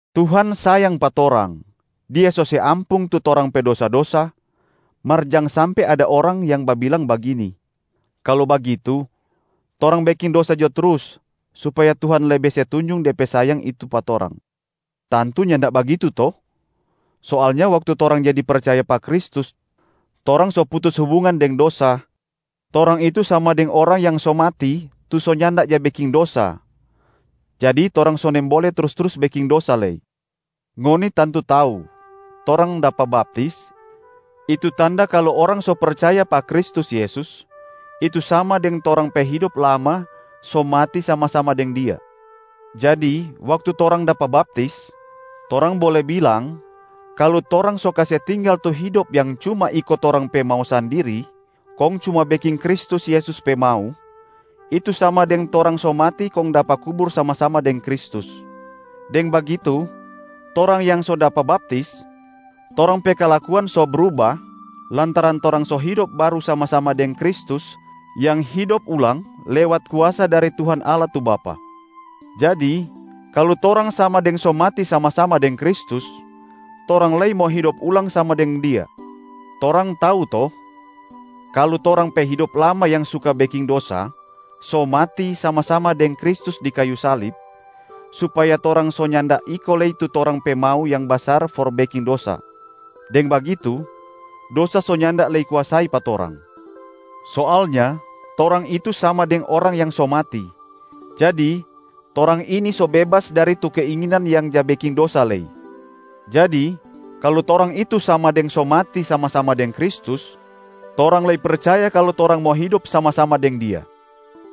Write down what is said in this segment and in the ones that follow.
Tuhan sayang pa torang, Dia so se ampung tu torang pe dosa-dosa, mar jang sampe ada orang yang babilang bagini, “Kalu bagitu, torang beking dosa jo trus supaya Tuhan lebe se tunjung De pe sayang itu pa torang.” Tantu nyanda bagitu to? Soalnya waktu torang jadi percaya pa Kristus torang so putus hubungan deng dosa, torang itu sama deng orang yang so mati tu so nyanda ja beking dosa, jadi torang so nimbole trus-trus beking dosa lei. Ngoni tantu tau, torang dapa baptis, itu tanda kalu orang so percaya pa Kristus Yesus, itu sama deng torang pe hidop lama so mati sama-sama deng Dia. Jadi waktu torang dapa baptis, torang bole bilang kalu torang so kase tinggal tu hidop yang cuma iko torang pe mau sandiri kong cuma beking Kristus Yesus pe mau, itu sama deng torang so mati kong dapa kubur sama-sama deng Kristus. Deng bagitu torang yang so dapa baptis, torang pe kalakuan so bruba lantaran torang so hidop baru sama-sama deng Kristus yang hidop ulang lewat kuasa dari Tuhan Allah tu Bapa. Jadi kalu torang sama deng so mati sama-sama deng Kristus, torang lei mo hidop ulang sama deng Dia. Torang tau to, kalu torang pe hidop lama yang suka beking dosa so mati sama-sama deng Kristus di kayu salib, supaya torang so nyanda iko lei tu torang pe mau yang basar for beking dosa. Deng bagitu, dosa so nyanda lei kuasai pa torang. Soalnya torang itu sama deng orang yang so mati, jadi torang ini so bebas dari tu keinginan yang ja beking dosa lei. Jadi kalu torang itu sama deng so mati sama-sama deng Kristus, torang lei percaya kalu torang mo hidop sama-sama deng Dia.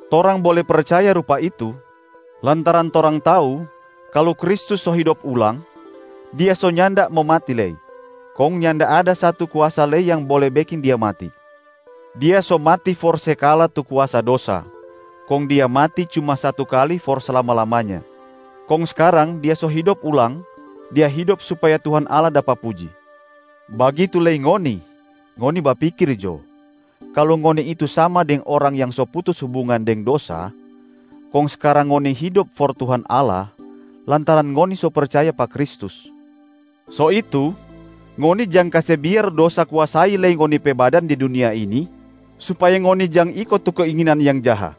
Torang bole percaya rupa itu lantaran torang tau kalu Kristus so hidop ulang, Dia so nyanda mo mati lei, kong nyanda ada satu kuasa lei yang bole beking Dia mati. Dia so mati for se kala tu kuasa dosa, kong Dia mati cuma satu kali for slama-lamanya. Kong skarang Dia so hidop ulang, Dia hidop supaya Tuhan Allah dapa puji. Bagitu lei ngoni, ngoni bapikir jo kalu ngoni itu sama deng orang yang so putus hubungan deng dosa, kong skarang ngoni hidop for Tuhan Allah lantaran ngoni so percaya pa Kristus. So itu, ngoni jang kase biar dosa kuasai lei ngoni pe badan di dunia ini supaya ngoni jang iko tu keinginan yang jaha.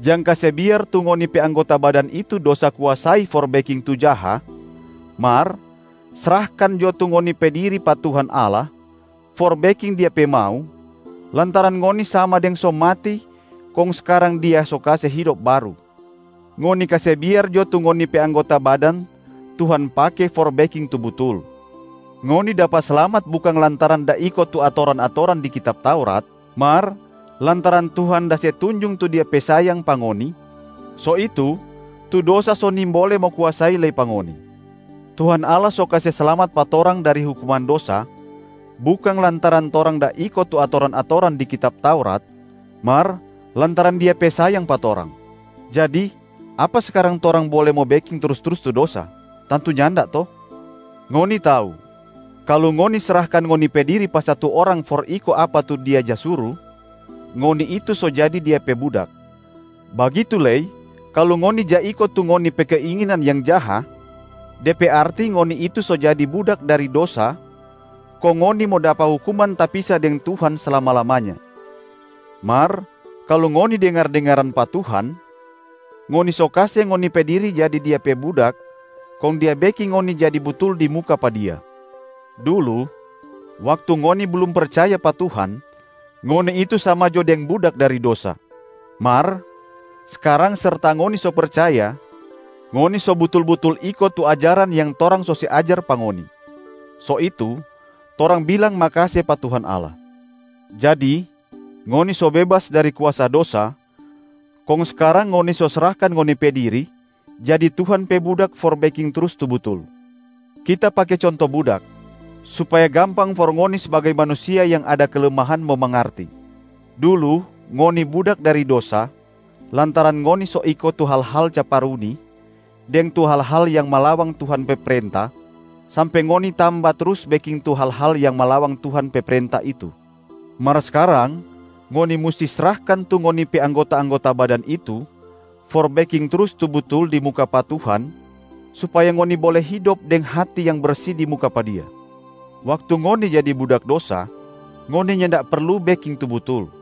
Jang kase biar tu ngoni pe anggota badan itu dosa kuasai for beking tu jaha, mar srahkan jo tu ngoni pe diri pa Tuhan Allah for beking Dia pe mau, lantaran ngoni sama deng so mati kong skarang Dia so kase hidop baru. Ngoni kase biar jo tu ngoni pe anggota badan Tuhan pake for beking tu butul. Ngoni dapa slamat bukang lantaran da iko tu atoran-atoran di kitab Taurat, mar lantaran Tuhan da se tunjung tu Dia pe sayang pa ngoni, so itu tu dosa so nimbole mo kuasai lei pa ngoni. Tuhan Allah so kase slamat pa torang dari hukuman dosa, bukang lantaran torang da iko tu atoran-atoran di kitab Taurat mar lantaran Dia pe sayang pa torang. Jadi apa skarang torang bole mo beking trus-trus tu dosa? Tantu nyanda to? Ngoni tau kalu ngoni srahkan ngoni pe diri pa satu orang for iko apa tu dia ja suru, ngoni itu so jadi dia pe budak. Bagitu lei kalu ngoni ja iko tu ngoni pe keinginan yang jaha, de pe arti ngoni itu so jadi budak dari dosa kong ngoni mo dapa hukuman tapisa deng Tuhan slama-lamanya. Mar kalu ngoni dengar-dengaran pa Tuhan, ngoni so kase ngoni pe diri jadi Dia pe budak kong Dia beking ngoni jadi butul di muka pa Dia. Dulu waktu ngoni blum percaya pa Tuhan, ngoni itu sama jo deng budak dari dosa. Mar skarang serta ngoni so percaya, ngoni so butul-butul iko tu ajaran yang torang so se ajar pa ngoni. So itu, torang bilang makase pa Tuhan Allah. Jadi, ngoni so bebas dari kuasa dosa kong skarang ngoni so srahkan ngoni pe diri jadi Tuhan pe budak for beking trus tu butul. Kita pake conto budak supaya gampang for ngoni sbagai manusia yang ada kelemahan mo mangarti. Dulu ngoni budak dari dosa lantaran ngoni so iko tu hal-hal caparuni deng tu hal-hal yang malawang Tuhan pe prenta sampe ngoni tamba trus beking tu hal-hal yang malawang Tuhan pe prenta itu. Mar skarang ngoni musti srahkan tu ngoni pe anggota-anggota badan itu for beking trus tu butul di muka pa Tuhan supaya ngoni bole hidop deng hati yang bersi di muka pa Dia. Waktu ngoni jadi budak dosa, ngoni nyanda perlu beking tu butul.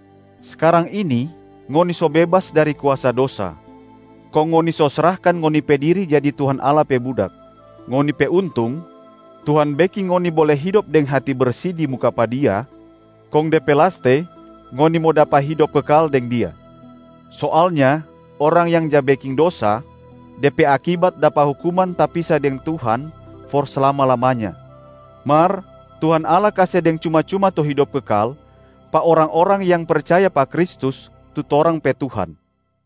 Skarang ini ngoni so bebas dari kuasa dosa, kong ngoni so srahkan ngoni pe diri jadi Tuhan Allah pe budak. Ngoni pe untung, Tuhan beking ngoni bole hidop deng hati bersi di muka pa Dia, kong de pe laste ngoni mo dapa hidop kekal deng Dia. Soalnya orang yang ja beking dosa, de pe akibat dapa hukuman tapisa deng Tuhan for slama-lamanya, mar Tuhan Allah kase deng cuma-cuma tu hidop kekal pa orang-orang yang percaya pa Kristus, tu torang pe Tuhan.